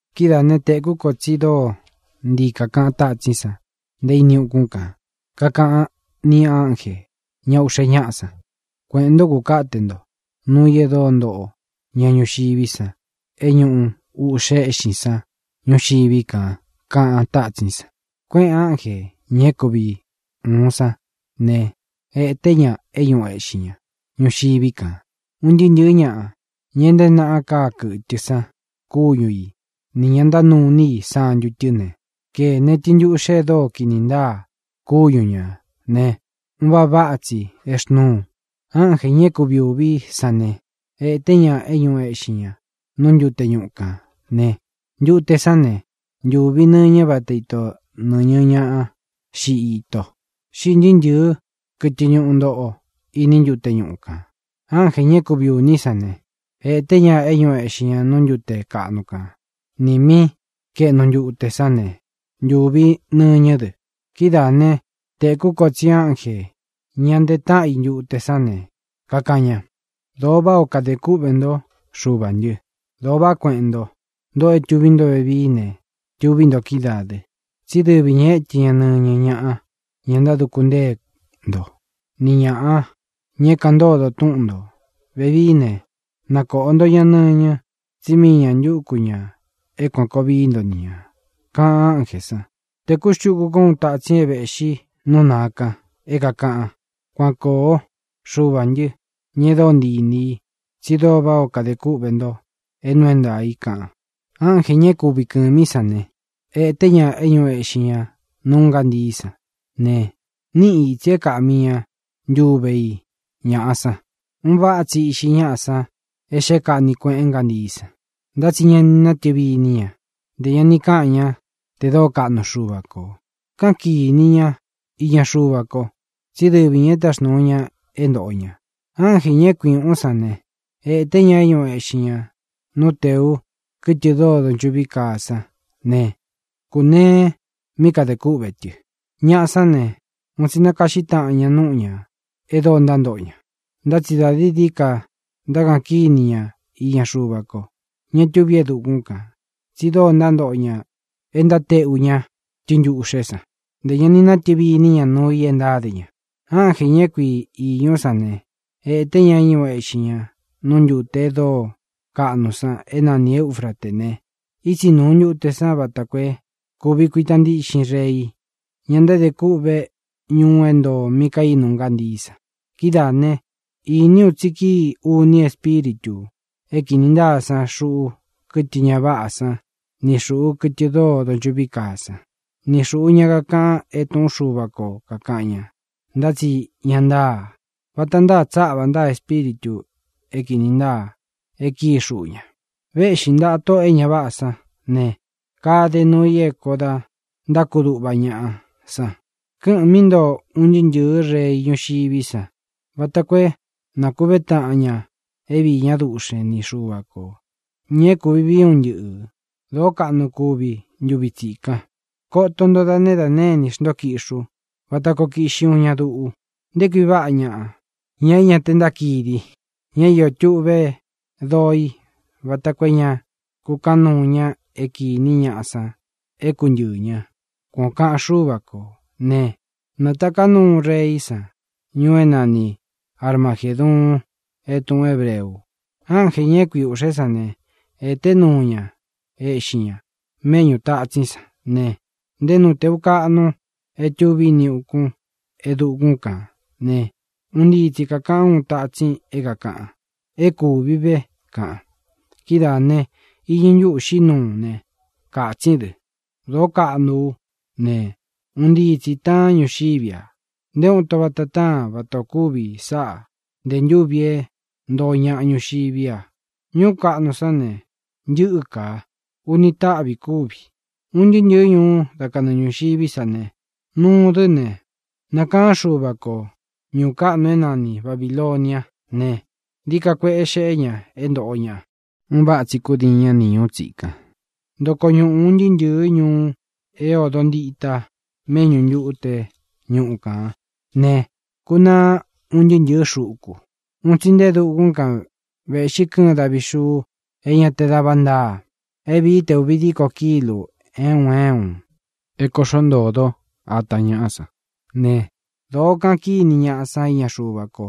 Kidáā né, tēkú ko tsi dóo ntii kākaꞌan tátsín san nte ini ukún kān, kakaꞌan ni ánjē, ña uꞌxe ñáꞌa san: —Kueꞌēn ntó, kūkáte nto nuu i e dóo ntoꞌo ña ñuxiví san é ñuꞌu ūꞌxe éꞌxin san ñuxiví kān —kaꞌan tátsín san. Kuéꞌēn ánjē, ña é kuvi ūun sán ne, ēté ña é ñūꞌu eꞌxin ña ñuxiví kān. Un ntɨɨ́ ntɨ̄ɨ́ ñaꞌa, ña é ntēé naꞌa káa kɨ̄tɨ san kúñu i nī ña ntánuu iní i santu tɨ́ ne, kēne tɨntuꞌxe e dóo kini ntáa kúñu ñā ne, un váꞌa váꞌa tsi exnúu. Ánjē, ña é kui ūví san ne, ēté ña é ñūꞌu eꞌxin ña nú ntute ñuꞌu kān ne, ntute sán ne, ntūvi nɨñɨ váta ito nɨ̄ñɨ ñá xiꞌi itō. Xíꞌī ntɨɨ́ ntɨ̄ɨ́ kɨtɨ ñuꞌu ntoꞌo iní ntute ñuꞌu kān. Ánjē, ña é kui ūní san ne, ēté ña é ñūꞌu eꞌxin ña nú ntute kaꞌnu kan nī mí kaēꞌnu ntute sán ne, ntuvi nɨñɨ́ dɨ. Kidáā né, tēkú ko tsi ánjē, ña nteé ntaꞌa i ntute sán ne, kakaꞌan ña: Dōo váꞌā ó kade kúꞌvē ntó, Xuvā ntɨ. Dōo vaꞌá kueꞌen nto, ntoꞌo é tuví nto vevií ne, tuví nto kídaā dɨ. Tsí dɨvi ñā étɨ ña nɨñɨ ñaꞌa, ña ntáduku ntée nto, ni ñāꞌa, ña é kāꞌan ntódo túꞌun ntō. Vevií ne, nakōꞌo nto ña nɨñɨ, tsí mii ñā ntúku ñā é kuān koo vií nto ni ñā, kaꞌan ánjē san. Tēkú xtuku kó uun tatsin é vēꞌxi nú nāa kan, é kākaꞌan: —Kuan koo, Xuvā ntɨ́, ña e dóo ntii inī i, tsi dóo váꞌā ó kadē kúꞌvē nto é nuu é ntaā i —kaꞌan. Ánjē, ña é kui kɨ̄mí san ne, ēté ña é ñūꞌu eꞌxin ña nú ngántií san ne, níꞌi ītsi é kāꞌmi ntúve i ñaꞌa san. Un váꞌa tsi íꞌxi ñáꞌa san é xeꞌé kaꞌni kuēꞌen ngántií san. Ntá tsi ñá ni nátɨvi iní ña, ntē ña ni káꞌan ña te dóo kaꞌnu Xuva kō. Káꞌan kīni ña iña Xuva ko, tsí dɨvi ñā e táxnūu ña é ntōꞌo ña. Ánjē, ña é kui ūꞌún san ne, ēté ña é ñūꞌu eꞌxin ña nú tēú kɨtɨ dóo donchuꞌví kaa san ne, kūnee mí kadē kúꞌvē tɨ. Ñaꞌa sán ne, un tsi nákaꞌxí taꞌan ña núꞌu ñā e dóo ntántoꞌo ña. Ntá tsi dā dií dií ka ntákaꞌan kíni ña iña Xuva ko, ña tuví e dukún kān, tsi dóo ntántoꞌo ña e ntáteꞌu ña tɨntuꞌxé san. Ntē ña ni natɨvi iní ña nuu ī e ntáde ña. Ánjē, ña é kui īñú san ne, ēté ña é ñūꞌu eꞌxin ña nú ntute e dóo kaꞌnu san é nani Eūfraté ne, ítsi nūu ntute san vata koo é kūvi kuita ntíꞌxin rei, ña ntáde kûꞌve ñuu é ntoo mí kaínu ngántií san. Kidáā né, īní u tsi kíi uni espíritū é kīni ntáa san xuꞌu kɨtɨ ña váꞌā sán ni xūꞌu kɨtɨ dóo donchuꞌví kaa san, ni xūꞌu ña kakaꞌan é tūꞌún Xuva ko kākaꞌan ña, ntá tsi ña ntáa. Vata ntáa tsáꞌvā ntáa espíritū é kīni ntáa e kíi xuꞌu ña. Véꞌxi ntāꞌa tóꞌō e ña váꞌā sán ne, kade nuu i é kōo da ntákuduꞌva ñaꞌa san. Kɨ́ꞌɨ̄n mí ntoo un ntɨɨ́ ntɨ̄ɨ́ rei ñuxiví san vata koo é nakūvé taꞌan ña é viī ñá duꞌxen ni Xuva kō, ña é kuvi vii é un ntɨꞌɨ̄. Dōó kaꞌnu kuvi ntuvi tsikan. “Koto nto tsí da née inī xntó kiꞌxi ú vata koo kiꞌxi uun ña duꞌu. Nté kui váꞌa ñaꞌa, ña é ña te ntákidi, ña é iō tuꞌvé doo i vata koo é ña kukáꞌan nuu ña é kīní ñaꞌa san é kuntɨɨ̄ ña”, kuan ō kaꞌan Xúva kō. Ne, nātaká nuu reí san ñuu é nani Armagēduun é tūꞌun hébreu. Ánjē, ña é kui ūꞌxé san ne, ēté ña é ñūꞌu eꞌxin ña méꞌñū tatsín san ne, nte nú tēu kaꞌnu é tuví ini ukun e dukún kān ne, un ntii tsi kākaꞌan úun tatsin é kākaꞌan: —¡É kūvi ve! —kaꞌan. Kidáā ne, iñɨ ntúꞌū xiꞌí nuu ne, kātsín dɨ. Dōo káñuꞌú ne, un ntii tsī taán ñuxiví a. Nté uun ito vata táan vata ō kúvi sáꞌa nte ntúvi é ntoo ñaꞌa ñuxiví a. Ñuú kaꞌnu sán ne, ntɨ́ka. Uni táꞌvī kúvi. Un ntɨɨ́ ntɨ̄ɨ́ ñuu dá kanɨɨ ñūxiví sa ne, nūu dɨ́ ne, nakaꞌan Xuva ko ñūu káꞌnu é nani Babīloniá ne, dií ka kueꞌe xeꞌé ña é ntōꞌo ña; un váꞌa tsi kúdiin ña ni ñūú tsikan. Ntoko ñuꞌu un ntɨɨ́ ntɨ̄ɨ́ ñuu é ōdo ntita méꞌñu ntute ñuꞌu kān né, kūnaá un ntɨɨ́ ntɨ̄ɨ́ xuku. Un tsi nte e dukún kan vēꞌxi kɨ́ɨn davi xuu é ña te da va ntáa, é vīí te ūvi díko kílū é un é un, é kōꞌxó ntōdó ata ñaꞌá san. Ne, dōó kaꞌan kíni ñaꞌa san iña Xuva ko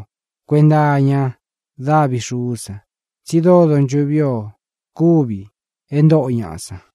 kuenta iña dávi xuú san, tsi dóo donchuꞌví o kúvi e ntóꞌo ñaꞌa san.